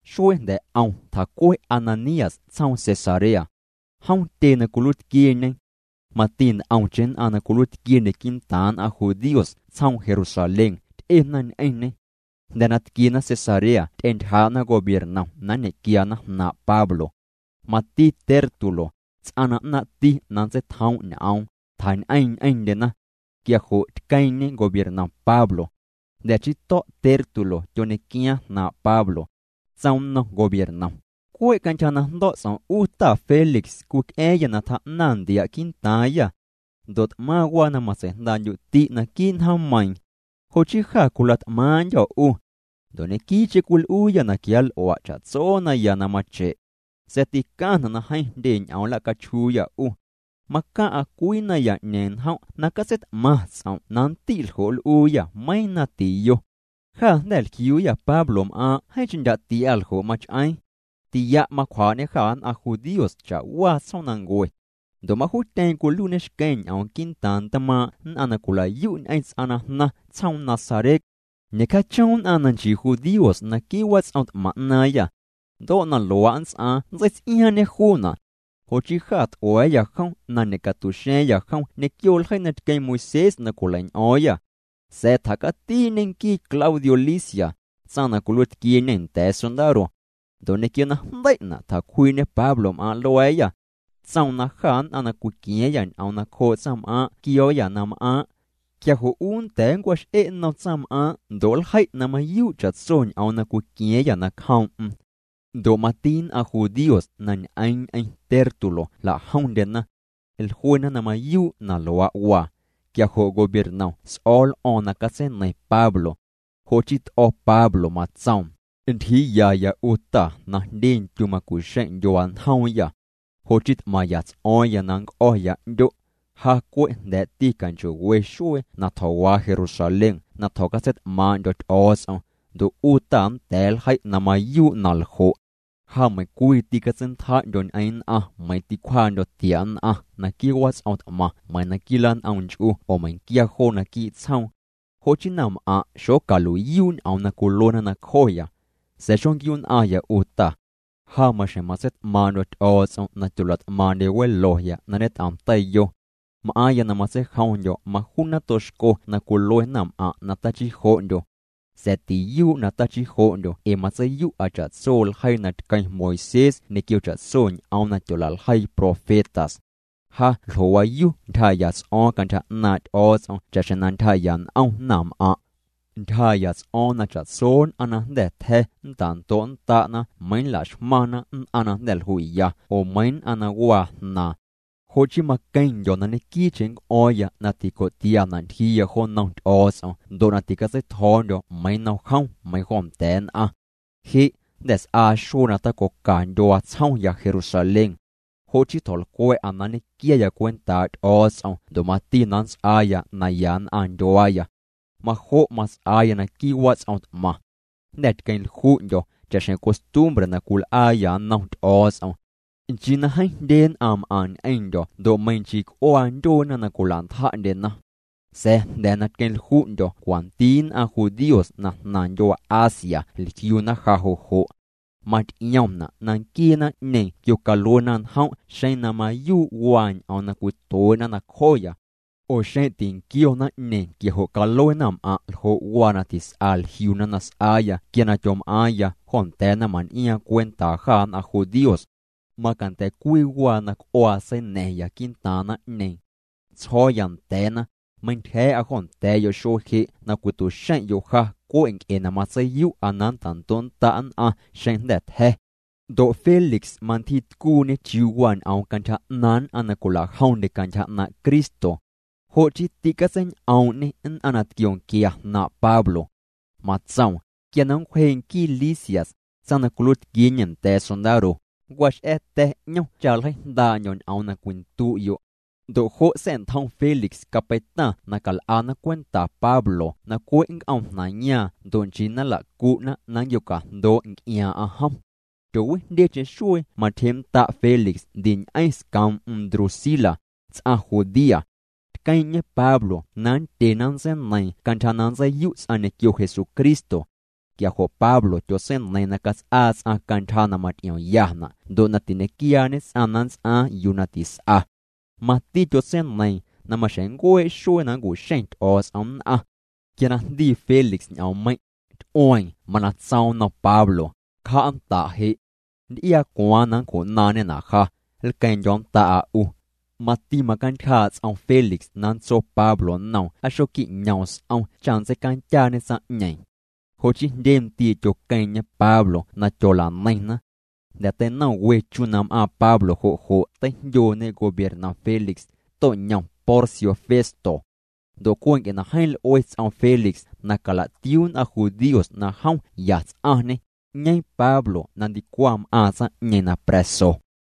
Xuee jnda̱ 'om tjacue Ananías tsjoom Cesarea. Jom tyee na cwiluiitquieñe. Mati nt'omcheⁿ nn'aⁿ na cwiluiitquiendye quii'ntaaⁿ nn'aⁿ judíos tsjoom Jerusalén ty'ena ñ'eⁿñê. Jnda̱ na tquiena Cesarea ty'entyjaa'na gobiernom na nñe'quiana jnaaⁿ' Pablo. Mati Tértulo, ts'aⁿ na 'naaⁿ'ti na nntseitjoom' ñ'oom, tjañ'eeⁿ ñ'eⁿndyena. Quia jo' tqueeⁿ'ñe gobiernom Pablo. Jnda̱ chii to̱' Tértulo tyoñequiaaⁿ jnaaⁿ' Pablo. Tsoom nnom gobiernom: —Cwe' cantyja na jndo̱' ts'om' 'u ta Félix cwic'a̱a̱ⁿyâ na tjaa'naⁿ ntia' quii'ntaaⁿyâ. Ndo' t'maⁿ waa na matsei'jndaa'ndyu'ti' naquii' njoommeiiⁿ. Jo' chii jâ cwila't'maaⁿ'ndyô̱ 'u. Ndo' ñequii'cheⁿ cwil'uuyâ na quianl'ua' cha'tso naya na mache'. Sa̱a̱ ticaⁿna' na jeeⁿ jndye ñ'oom nla'cachjuuyâ 'u. Macaⁿ'a cwii naya'ñeeⁿ njom' na catseit'maⁿ ts'om' na nndi' ljo' nl'uuyâ meiiⁿ na tiyo. Jâ jnda̱ jliuuyâ Pablom'aaⁿ' jeeⁿcheⁿ ndya' tia ljo' mach'eeⁿ. Tia' macwjaa'ñê jâ nn'aⁿ judíos cha'waa tsjoomnancue. Ndo' majuutyeeⁿ cwiluiiñê xqueⁿ ñ'oom quii'ntaaⁿ ntmaaⁿ' nn'aⁿ na cwila'yu' ñ'eⁿ ts'aⁿ na jnaⁿ tsjoom Nazaret. Ñe'cjaachom nn'aⁿ na nchii judíos naquii' wats'om t'maⁿ 'naaⁿyâ. Ndo' na luaa' nnts'aaⁿ nntseits'iaaⁿñê juuna'. Jo' chii jâ t'ua̱a̱yâ jom na ñe'catu'xa̱a̱ⁿyâ jom ñequio ljeii na tqueⁿ Moisés na cwileiñ'o̱o̱ⁿyâ. Sa̱a̱ tjacatii'ñe nquii Claudio Lisias, tsaⁿ na cwiluiitquieñe nda̱a̱ sondaro. Ndo' ñequio na jndei'na' tjacwjii'ñê Pablom'aaⁿ' lua̱a̱yâ. Tsoom na jâ nn'aⁿ na cwiqua̱a̱ⁿyâ ñ'oom nacjoo' tsaⁿm'aaⁿ' quio̱o̱yâ na m'aaⁿ'. Quia jo' 'u nnda̱a̱ nncwax'e' nnom tsaⁿm'aaⁿ' ndo' nljei' na mayuu' cha'tso ñ'oom na cwiqua̱a̱ⁿyâ nacjoom'm. Ndo' mati nn'aⁿ judíos na ñ'eeⁿna ñ'eⁿ Tértulo jla'jomndyena. Jluena na mayuu' na luaa' waa. Quia jo' gobiernom s'o̱o̱ l'o̱o̱ⁿ na catseineiⁿ Pablo. Jo' chii t'o̱ Pablo matsoom: —Ntyjiiyaya 'u ta na jndye ndyu macu'xeⁿ' ndyuaa njoomyâ. Jo' chii t'maⁿya ts'o̱o̱ⁿya na nnc'o̱ya 'ndyo'. Ja cwe' jnda̱'ti canchoo'we xuee na tjo̱waa Jerusalén na tjo̱catseit'maaⁿ'ndyo̱ Ty'o̱o̱ts'om, ndo' 'u ta nnda̱a̱ nljei' na mayuu' na ljo'. Ja meiⁿcwii tîcatseintja'ndyo̱ ñ'eⁿ nn'aⁿ meiⁿ ticwjaa'ndyo̱ tia' nn'aⁿ naquii' wats'om t'maⁿ meiⁿ naquii' lan'om nch'u oo meiⁿquia joo naquii' tsjoom. Jo' chii naⁿm'aⁿ' xocalui'yuu' ñ'oom na cwiluena nacjoya. Sa̱a̱ xonquiu'nn'aⁿya 'u ta. Ja maxjeⁿ matseit'maaⁿ'ndyo̱ Ty'o̱o̱ts'om na tyola't'maaⁿ'ndye weloya na ñet'om teiyo. M'aaⁿya na matseijomndyo̱ majuu nato xco na cwilue naⁿm'aⁿ' na tachii jo'ndyo. Sa̱a̱ tiyuu' na tachii jo'ndyo ee matseiyu'a cha'tso ljeii na tqueⁿ Moisés ñequio cha'tso ñ'oom na tyola'ljeii profetas. Ja ljo'waayu ntyjaa'ya ts'o̱o̱ⁿya cantyja 'naaⁿ' Ty'o̱o̱ts'om cha'xjeⁿ na ntyjaa'ya n'om naⁿm'aⁿ'. Ntyjaa'ya ts'o̱o̱ⁿya na cha'tso nn'aⁿ na jnda̱ tja̱ nnta'ndo'nnda' meiiⁿ laxmaⁿna nn'aⁿ na jnda̱ jlui'ya oo meiiⁿ nn'aⁿ na waa jnaaⁿ. Jo' chii maqueⁿndyo̱ na ñequii'cheⁿ nnc'o̱o̱ⁿya na tico'tiana' ntyjiiya jo nnom Ty'o̱o̱ts'om ndo' ticatseitjo̱o̱ndyo̱ meiⁿ nnom jom meiⁿ jo nda̱a̱ nn'aⁿ. ’Je' jnda̱ s'aa xuee na tacoca ndyuaa tsjomya Jerusalén. Jo' chii tjo̱lcwa̱'a na nñe'quiaya cwentaa' Ty'o̱o̱ts'om ndo' mati na nnts'aaya naya nn'aⁿ ndyuaaya. Majo' mats'aaya naquii' wats'om t'maⁿ. Jnda̱ tqueⁿlju'ndyo̱ cha'xjeⁿ costumbre na cwil'aayâ nnom Ty'o̱o̱ts'om. Nchii na jeeⁿ jndye nn'aⁿ m'aⁿ ñ'eⁿndyo̱ ndo' meiⁿ nchii c'uaa ndyueena na cwila'ntja'ndyena. Sa̱a̱ jnda̱ na tqueⁿlju'ndyo̱ cwanti nn'aⁿ judíos na jnaⁿ ndyuaa Asia jliuna ja jo' jo'. Maty'iomna' na nquiee naⁿ'ñeeⁿ quiocaluena njom' xeⁿ na mayuu' waa ñ'oom na cwituee'na nacjoya. Oo xeⁿ tinquio naⁿ'ñeeⁿ quia jo' calue naⁿm'aⁿ' ljo' waa na tis'a jliuna na s'aaya quia na tyom'aaⁿya jo nda̱a̱ naⁿman'iaaⁿ cwentaa jâ nn'aⁿ judíos. Macanda̱ cwii waa na c'uaa seina̱ⁿya quii'ntaaⁿ naⁿ'ñeeⁿ. Tsjo̱o̱ya nda̱a̱na: “Meintyja̱a̱'a jo nda̱a̱'yo' xuee je' na cwitu'xeⁿ'yo' ja cwe' nc'e na matseiyu'a na nta'ndo'nnda' nn'aⁿ xeⁿ jnda̱ tja̱.” Ndo' Félix mantyjiitcuuñê chiuu waa ñ'oom cantyja 'naaⁿ nn'aⁿ na cwila'jomndyena cantyja 'naaⁿ' Cristo. Jo' chii tîcatsein'oom'ñê nn'aⁿ na tquionquia jnaaⁿ' Pablo. Matsoom: —Quia na nncwjee' nquii Lisias, tsaⁿ na cwiluiitquieñe nda̱a̱ sondaro, nncwax'a̱tya̱ 'ñom cha nljeijndaa'ndyo̱ ñ'oom na cwindu'yo'. Ndo' jo' sa̱'ntjom Félix capeitaⁿ na cal'ana cwenta Pablo na cwe' nnc'oomjnaⁿyaaⁿ ndo' nchii na nla'cu'na na nnquiocajndoo' nc'iaaⁿ'aⁿ jom. Tyoowijndyecheⁿ xuee matyjee'nnda' Félix ndi ñ'eⁿ scoom'm Drusila, ts'aⁿ judía. Tqueeⁿ'ñê Pablo na nndyena nntseineiiⁿ cantyja na nntseiyu' ts'aⁿ ñequio Jesucristo. Quia jo' Pablo tyotseineiiⁿ na cats'aa ts'aⁿ cantyja na maty'iomyana' ndo' na tiñequiaañe ts'aⁿ na nnts'aaⁿ yuu na tis'a. Mati tyotseineiiⁿ na maxjeⁿ nncuee' xuee na nncu'xeⁿ Ty'o̱o̱ts'om nn'aⁿ. Quia na jndii Félix ñ'oommeiⁿ', ty'ueeⁿ. Mana tsoom nnom Pablo: —Cja'nnda' je'. Nnty'iaa cwaaⁿ na nncju'naaⁿñena' ja, nlqueeⁿ'ndyo̱nnda'a 'u. Mati macantyjaa' ts'om Félix na nntso Pablo nnoom aa xoquiñoom s'om cha nntseicandyaañê tsaⁿ'ñeeⁿ. Jo' chii jndye ndii' tyoqueeⁿ'ñê Pablo na tyola'neiⁿna. Jnda̱ teinom we chu na m'aaⁿ Pablo jo' jo' teijndyooñe gobiernom Félix, to'ñom Porcio Festo. Ndo' cwe' na jeeⁿ l'ue ts'om Félix na cala'tiuu nn'aⁿ judíos na jom ya ts'aⁿñê, 'ñeeⁿ Pablo na ndicwaⁿ m'aaⁿ tsaⁿ'ñeeⁿ na pra̱so.